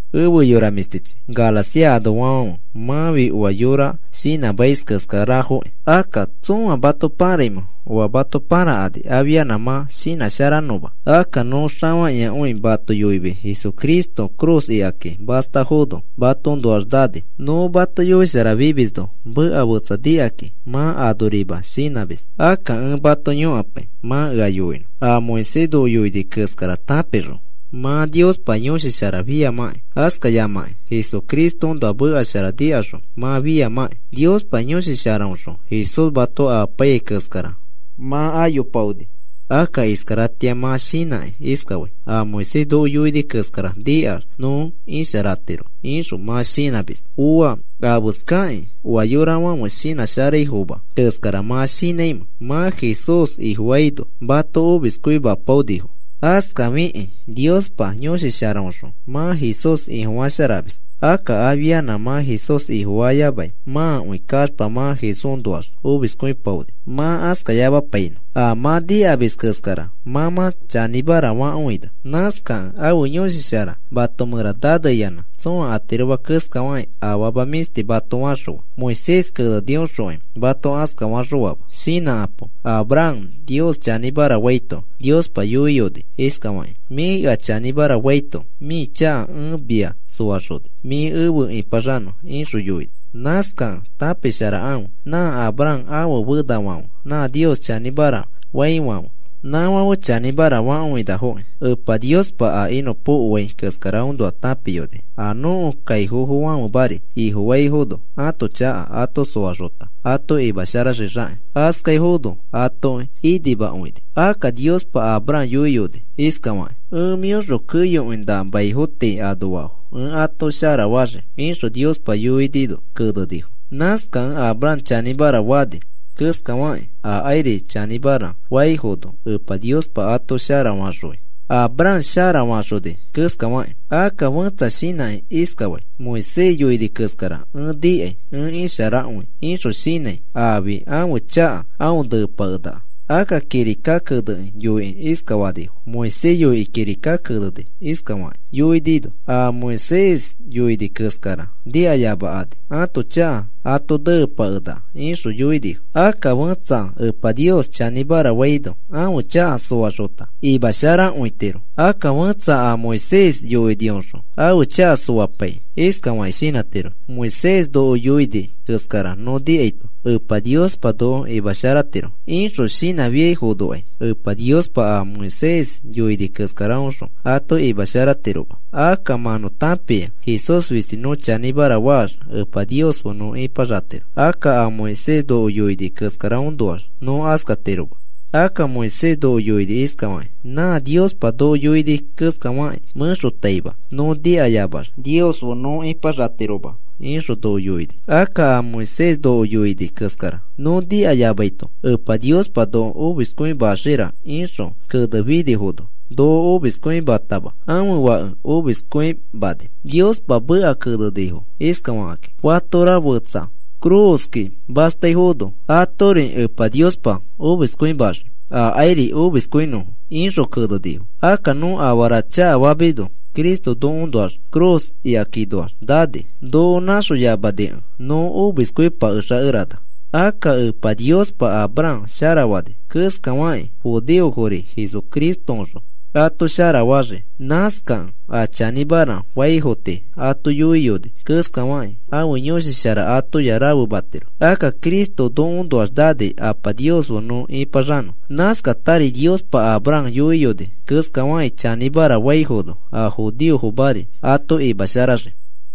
Efe yora mĩshtichi Galacia anoafãfe, mãfi oa yõra shinãsharaima keskarafoki. Akka, ¿tsõa mato paraimẽ oa mato parakani afianã mã shinãsharanõma? Akka nõ xafakĩakõi mato yoimis Jesucristo ifi cruz ikaki mastafono matoõnoax nani. Nõ mato yoisharafimisno meka fetsa nikakĩ mã anorima shinãmis. Akka ẽ mato yõkapai mã ea yoinõ a Moisés noko yoini keskara tãpixõ mã Niospa Yõshi Shara fiamãki, askayamaki Jesucristoõnoa meka shara nikaxõ mã fiamãki. Niospa Yõshi Sharaõxõ Jesús mato amapaiyai keskara mã ayopaoni. Akka iskaratĩa mã shinãkĩ iskafai: “A Moisés noko yoini keskara nikax nõ isharatiro,” ixõ mã shinãmis. Ooa. ¿Afeskakĩ oa yorafãfe shinãsharaifoma keskara mã shinãimẽ? Mã Jesús Ifofaino mato omiskõimapaonifo, askafikĩ Niospa Yõshi Sharaõxõ mã Jesús Ifofasharamis. Akka afianã mã Jesús Ifofayamai mãkõi kaxpa mã Jesúsnoax omiskõipaoni. Mã askayamapainõ. A mã nikamis keskara mã mã chanĩmara fakõina. Nãskakẽ ãfe Yõshi Shara mato mẽra naneyanã, tsõa atiroma keskafakĩ afama mĩshti mato faxõfa. Moisés kenenioxokai mato askafaxõama. Shinãkapo. Abraham Nios chanĩmara faito Niospa yoiyoni iskafakĩ: “Mĩ ea chanĩmara faito mĩ chaka ẽ mia soaxoni mĩ efe ipaxanõ,” ixõ yoini. Nãskakẽ tãpisharakãfe nã Abraham ãfe fenafãfe nã Nios chanĩmara faifãfe, nãfãfe chanĩmara fakõinafoki. Epa Niospa a inõpokoai keskaraõnoa tãpiyoni a nõko kaifofofãfemari Ifofaifono ãto chaka ato soaxota ato imasharaxixakĩ. Askaifono atoki inimakõini, akka Niospa Abraham yoiyoni iskafakĩ: “Ẽ mĩõxõ keyokõi nã maifo tii anoafo ẽ ato sharafaxii,” ixõ Niospa yoinino kenenifo. Nãskakẽ Abraham chanĩmara fani keskafakĩ, akairi chanĩmara faifono Epa Niospa ato sharafaxõi, Abraham sharafaxoni keskafakĩ. Akka fẽtsa shinãkĩ iskafai: “Moisés yoini keskara ẽ nikai ẽ isharakõi,” ixõ shinãi afi ãfe chaka aõ nepakenaka. Akka kirika kenekĩ yoikĩ iskafanifo: “Moisés yoikĩ kirika kenekĩ iskafakĩ yoinino: ‘A Moisés yoini keskara nikayamakani ãto chaka ãto nepakenaka,’” ixõ yoinifo. Akka fẽtsa Epa Nios chanĩmara faino ãfe chaka soaxota imasharakõitiro. Akka fẽtsa a Moisés yoinioxõ ãfe chaka soapaikĩ iskafakĩ shinãtiro: “Moisés noko yoini keskara nõ nikaito Epa Niospa noko imasharatiro,” ixõ shinãfiafonokai Epa Niospa a Moisés yoini keskaraõxõ ato imasharatiroma. Akka mã nõ tãpia Jesús fisti nõ chanĩmara faax Epa Nios fe nõ ipaxatiro. Akka a Moisés noko yoini keskaraõnoax nõ askatiroma. Akka Moisés noko yoini iskafakĩ: “Nã Niospa noko yoini keskafakĩ mẽxotaima nõ nikayamax Nios fe nõ ipaxatiroma,” ixõ noko yoini. Akka a Moisés noko yoini keskara: “Nõ nikayamaito Epa Niospa noko omiskõimaxira,” ixõ kenefinifono, noko omiskõimatama, ãfe Fake omiskõimani. Niospa meka kenenifo iskafakĩ: “Fatora fetsa ifi cruz ikaki mastaifono, atori Epa Niospa omiskõimaxii akairi omiskõinõfo,” ixõ kenenifo. Akka nõ afara chakafamisno Cristo nokoõnoax ifi cruz ikakinoax nani. Noko nãxoyamanikẽ nõ omiskõipakexakerana. Akka Epa Niospa Abraham sharafani keskafakĩ, judeofori Jesucristoõxõ ato sharafaxii. Nãskakẽ a chanĩmara faifo tii ato yoiyoni keskafakĩ ãfe Yõshi Shara atoya rafematiro. Akka Cristo nokoõnoax nani Apa Nios fe nõ ipaxanõ. Nãskatari Niospa Abraham yoiyoni keskafakĩ chanĩmara faifono a judeofomari ato imasharaxii.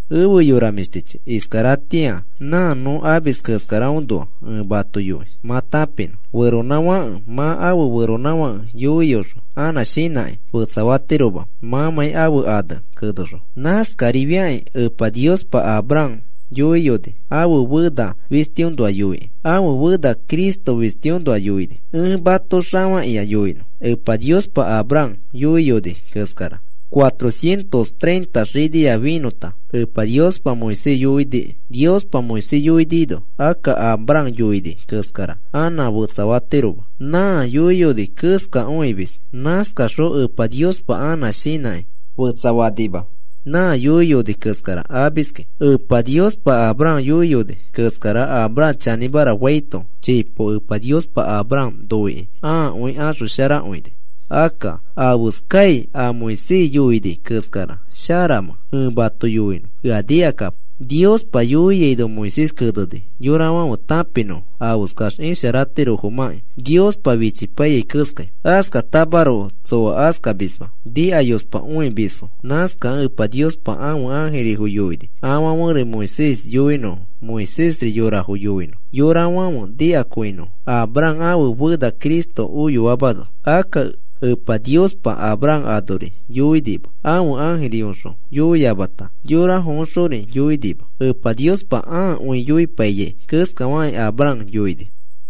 Efe yora mĩshtichi, iskaratĩa nã nõ amis keskaraõnoa ẽ mato yoi mã tãpinõ. Feronãfake mã afe feronãfake yoiyoxõ anã shinãkĩ fetsafatiroma mãmãi ãfe ane kenexõ. Nãskarifiakĩ Epa Niospa Abraham yoiyoni ãfe fena fistiõnoa yoikĩ. Ãfe fena Cristo fistiõnoa yoini. Ẽ mato xafakĩa yoinõ Epa Niospa Abraham yoiyoni keskara cuatro cientos treinta xinia finõta Epa Niospa Moisés yoiniki. Niospa Moisés yoinino akka Abraham yoini keskara anã fetsafatiroma. Nã yoiyoni keskakõimis. Nãskaxõ Epa Niospa anã shinãkĩ fetsafanima, nã yoiyoni keskara amiski. Epa Niospa Abraham yoiyoni keskara Abraham chanĩmara faito, chipo Epa Niospa Abraham noikĩ ãakõi axosharakõini. Akka, ¿afeskai a Moisés yoini keskara sharamẽ? Ẽ mato yoinõ, ea nikakapo. Niospa yoiaino Moisés keneni yorafãfe tãpinõfo afeskax isharatirofomãki, Niospa fichipaiyai keskai. Askatamaroko tsoa askamisma, nikayospakõimisfo. Nãskakẽ Epa Niospa ãfe ãjirifo yoini afãferi Moisés yoinõfo Moisésri yorafo yoinõ yorafãfe nikakõinõfo Abraham ãfe fena Cristo oyoamano. Akka Epa Niospa Abraham anori yoinima. Ãfe ãjiriõxõ yoiyamata, yorafoõxori yoinima. Epa Niospa ãakõi yoipaiyai keskafakĩ Abraham yoini.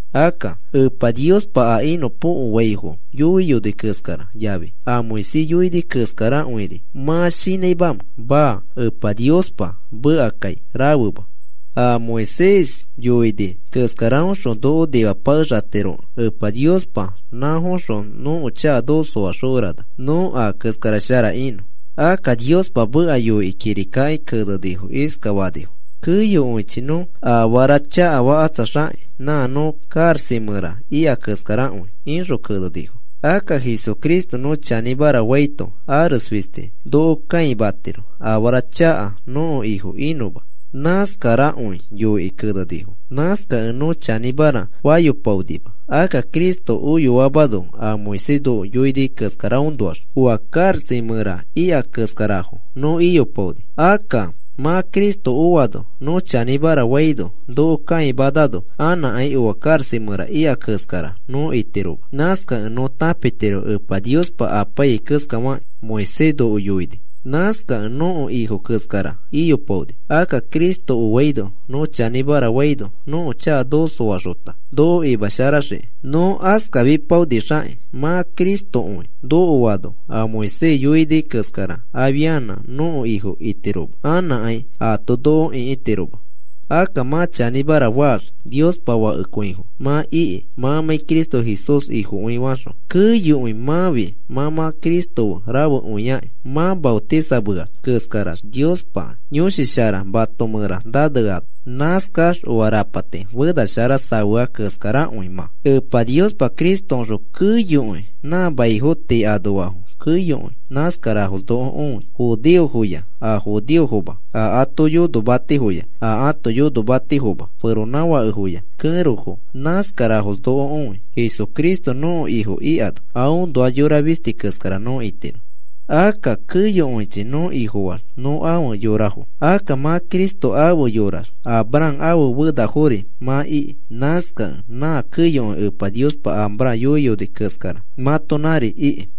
Akka, ¿Epa Niospa a inõpokoaifo yoiyoni keskara yafi a Moisés yoini keskarakõiri mã shinãimamẽ? Maa. Epa Niospa mekakai rafema. A Moisés yoini keskaraõxõ noko nimapakexatirokẽ Epa Niospa nãfoxõ nõko chaka noko soaxokerana nõ a keskara shara inõ. Akka Niospa meka yoikĩ kirikaki kenekĩ iskafanifo: “Keyokõichi nõ afara chakafakatsaxakĩ nã nõ karaxa mẽra ika keskarakõi,” ixõ kenenifo. “Akka Jesucristo nõ chanĩmara faito ares fisti noko kãimatiro afara chaka nõko ifo inõma.” Nãskarakõi yoikĩ kenenifo. Nãskakẽ nõ chanĩmara fayopaonima. Akka Cristo oyoamano a Moisés noko yoini keskaraõnoax oa karaxa mẽra ika keskarafo nõ iyopaoni. Akka mã Cristo oano nõ chanĩmara faino noko kaimanano anãkai oa karaxa mẽra ika keskara nõ itiroma. Nãskakẽ nõ tãpitiro Epa Niospa apaiyai keskafakĩ Moisés noko yoini. Nãskakẽ nõko ifo keskara iyopaoni. Akka Cristo oaino nõ chanĩmara faino nõko chaka noko soaxota noko imasharaxiki. Nõ askafipaonixakĩ mã Cristokõi nokoano a Moisés yoini keskara afianã nõko ifo itiroma anãkai aato noko ĩkitiroma. Akka mã chanĩmara faax Niospa fakekõifo mã iki mãmãi Cristo Jesús Ifokõi faxõ. Keyokõi mãfi mã mã Cristo fe rafekõiakĩ mã maotisameax keskarax Niospa Yõshi Shara mato mẽra naneano. Nãskax oa rapati fena shara safea keskarakõi mã. Epa Niospa Cristoõxõ keyokõi nã maifo tii anoafo keyokõi nãskarafos noko õi. Judeofoya a judeofoma, a ato yonomatifoya a yonomatifoma, feronãfakefoya kẽrofo, nãskarafos noko õi. Jesucristo nõko Ifo ikano aõnoax yora fisti keskara nõ itiro. Akka keyokõichi nõ Ifofaax nõ afe yorafo. Akka mã Cristo afe yorax Abraham ãfe fenafori mã iki. Nãskakẽ nã keyokõi Epa Niospa Abraham yoiyoni keskara mãtonãri iki.